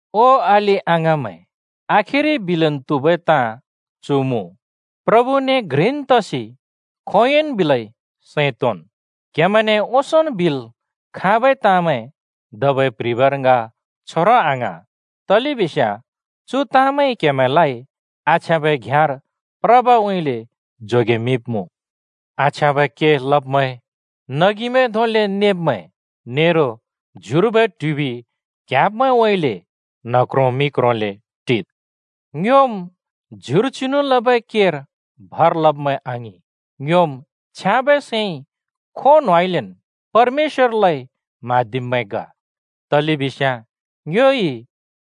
ओ अलि-अङाँमैं, आखिरि बिलन् त्हुबै ताँ चु मुँ: प्रभुने घ्रिन् तसि खोंयोंन् बिलै सैं तोंन्। क्हेमैंने ओंसोंन् बिल् खाँबै ताँमैं धबै प्‍ह्रिबर ङ छोरों आङ्हाँ, तलेबिस्याँ चु ताँमैंइ क्‍हेमैंलाइ आछ्याँबै घ्याँर प्रबउँइँले जोगेमिंमुँ। आछ्याँबै के लब्‍मैं, नगिमैं धोंले नेब्मैं, नेरो ज्युर्बै ट्हुबि क्‍याँब्मैंउँइँले न्ह क्रों मि क्रोंले टिद्। ङ्योम् ज्युर चिनु लबै केर भर लब्मैं आङिं! ङ्योम् छ्याँबै सैंइ खों न्होंउँइँलेन् परमेश्‍वरलाइ म्हाँदिब्मैं ग, तलेबिस्याँ ङ्योइ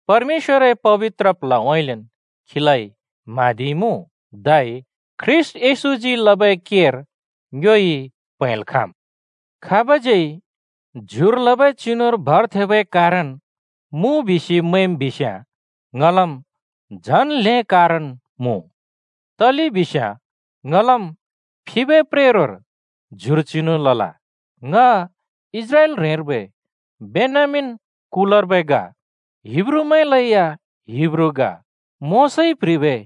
परमेश्‍वरए पबित्र प्ल्हउँइँलेन् खीलाइ म्हाँदिइमुँ। धै ख्रीष्‍ट येशूजी लबै केर ङ्योइ प्हैंल् खाँम्। खाबज्यै ज्युर लबै चिनुर भर थेंबै कारण मुँ बिसि मैंम् बिस्याँ, ङलम् झन् ल्हें कारण मुँ। तलेबिस्याँ ङलम् फिबै प्रेरोर ज्युर चिनु लल। ङ इस्राएल ह्रेंर्बै बेन्यामीन कुलर्बै ग, हिब्रूमैंलैया हिब्रू ग, मोशाइ प्ह्रिबै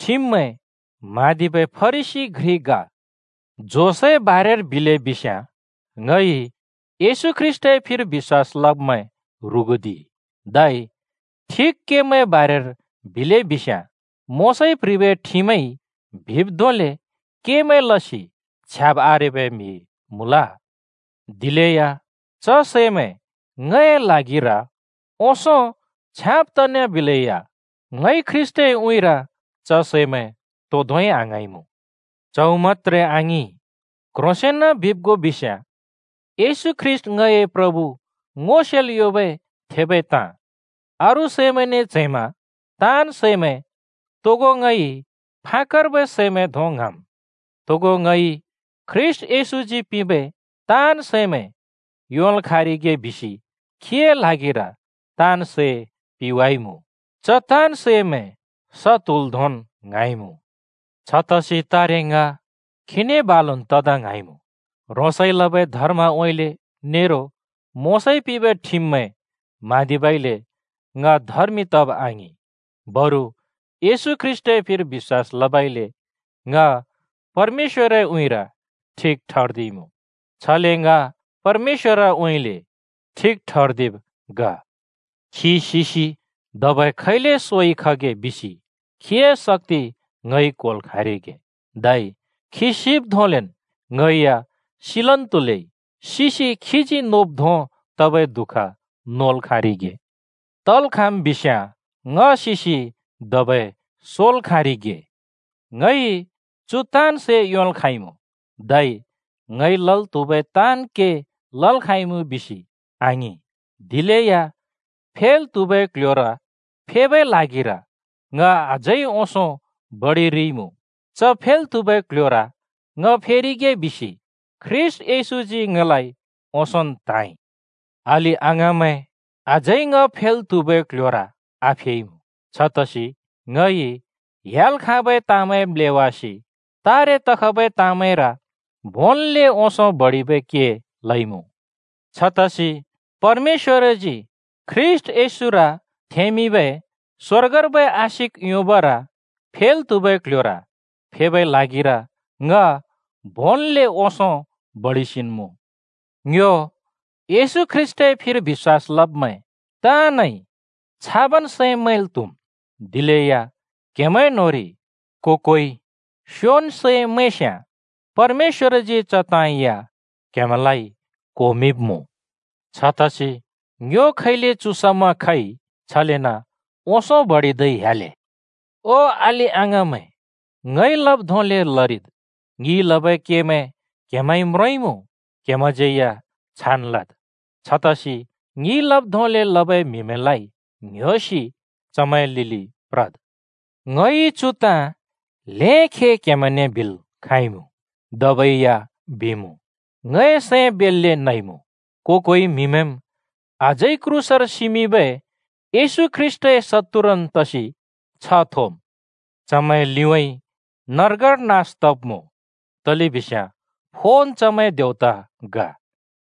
ठिममैं म्हाँदिबै फरिसी घ्रि ग, जोसए बारेर बिले बिस्याँ, ङइ येशू ख्रीष्‍टए फिर बिश्‍वास लब्मैं ह्रुगुदिइ! धै ठिक केमैंए बारेर बिले बिस्याँ मोशाइ प्ह्रिबै ठिममैंइ बिब् धोंबै केमैं लसि छ्याब् आरेबै म्हि मुँल। दिलेया च सैंमैं ङए ल्हागिर ओंसों छ्याँब तना बिलेया ङइ ख्रीष्‍टए उँइँर च सैमैं तो धोंइ आङ्हाँइमुँ। च्हौ मत्‍त्रे आङिं, क्ह्रोंसेंन बिब् गो बिस्याँ येशू ख्रीष्‍ट ङए प्रभु ङो सेल् योंबै थेबै ताँ, अरू सैमैंने च्हैंमा ताँन् सैमैं तोगो ङइ फाकर्बै सैमैं धों ङ्हाँम्। तोगो ङइ ख्रीष्‍ट येशूजी पिंबै ताँन् सैमैं योंल् खाँरिगे बिसि खीए ल्हागिर ताँन् सै पिवाइमुँ, च ताँन् सैमैं स त्हुल धोंन् ङ्हाँइमुँ। छतसि तारे ङ खीने बालुन् तदा ङ्हाँइमुँ। ह्रोंसइ लबै धर्मउँइँले, नेरो मोशाइ प्ह्रिबै ठिममैं म्हाँदिबइले ङ धर्मि तब आङि, बरु येशू ख्रीष्‍टए फिर बिश्‍वास लबइले ङ परमेश्‍वरए उँइँर ठिक ठर्दिइमुँ। छले ङ परमेश्‍वरउँइँले ठिक ठर्दिब् ग। खी सिसि धबै खैले सोइ खगे बिसि खीए शक्‍ति ङइ क्होल् खाँरिगे, धै खी सिब् धोंलेन् ङइ या सिलन् त्हुलै सिसि खीजी नोब् धों तबै दु:ख नोल् खाँरिगे। तल् खाँम् बिस्याँ ङ सिसि धबै सोल् खाँरिगे। ङइ चु ताँन् सै योंल् खाँइमुँ धै ङइ लल् त्हुबै ताँन् के लल् खाँइमुँ बिसि आङिं, दिलेया फेल् त्हुबै क्ल्ह‍योर फेबै ल्हागिर ङ अझै ओंसों बडिरिइमुँ। च फेल् त्हुबै क्ल्ह‍योर ङ फेरिगे बिसि ख्रीष्‍ट येशूजी ङलाइ ओंसोंन् त्हाँइ। अलि-अङाँमैं, अझै ङ फेल् त्हुबै क्ल्ह्‍योर आफेइमुँ। छतसि ङइ ह्‍याल् खाँबै ताँमैं म्‍लेवासि तारे तखबै ताँमैंर भोंन्ले ओंसों बडिबै के लइमुँ। छतसि परमेश्‍वरजी ख्रीष्‍ट येशूर थेंमिंबै स्वर्गर्बै आशिक योंबर फेल् त्हुबै क्ल्ह्‍योर फेबै ल्हागिर ङ भोंन्ले ओंसों बडिसेन्मुँ। ङ्यो येशू ख्रीष्‍टए फिर बिश्‍वास लब्मैं ताँनइ छाबन् सैं मैंल् त्‍हुम्। दिलेया क्‍हेमैं न्‍होंरि को-कोइ स्योबन् सैं मैंस्‍याँ परमेश्‍वरजी च ताँ या क्‍हेमैंलाइ क्होमिंब्‍मुँ। छतसि ङ्यो खैले चु समा खइ, छलेन ओंसों बडिदै ह्‍याले। ओ अलि-अङाँमैं, ङइ लब् धोंले लरिद्। ङिइ लबै केमैं क्हेमैंइ म्रोंइमुँ, क्हेमैंज्यै या छान् लद्। छतसि ङिइ लब् धोंले लबै म्हिमैंलाइ ङ्ह्‍योसि चमैंए लिलि प्रद्। ङइ चु ताँ ल्‍हें खे क्हेमैंने बिल् खाँइमुँ, धबै या बिमुँ। ङए सैं बेल्‍ले नइमुँ। को-कोइ म्हिमैंम् अझै क्रूसर सिमिंबै येशू ख्रीष्‍टए शत्तुरन् तसि छ्ह थोम्। चुमैं लिउँइँ नर्गर नास तब्‍मुँ, तलेबिस्याँ फोन् चुमैंए देवता ग।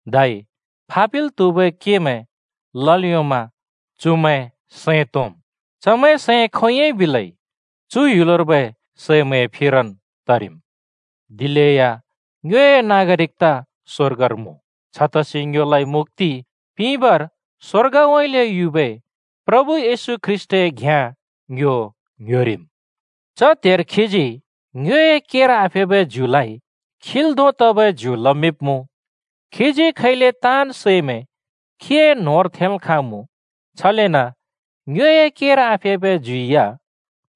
धै फापिल् त्‍हुबै केमैं लल् योंमा चुमैं सैं तोंम। चमैंए सैं खोंयोंइ बिले चु ह्‍युलर्बै सैमैंर फिरन् तरिम्। दिलेया ङ्योए नागरिकता स्वर्गर मुँ। छतसि ङ्योलाइ मुक्‍ति पिंबर स्वर्गउँइँले युबै प्रभु येशू ख्रीष्‍टए घ्याँ ङ्यो ङ्‍ह्‍योरिम्। च त्हेर खीजी ङ्योए केर आफेबै ज्युलाइ खील् धों तबै ज्यु लमिंब्मुँ। खीजी खैले ताँन् सैमैं खीए न्होंर थेंल् खाँमुँ, छलेन ङ्योए केर आफेबै ज्यु या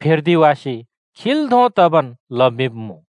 फेर्दिवासि खील् धों तबन् लमिंब्‍मुँ।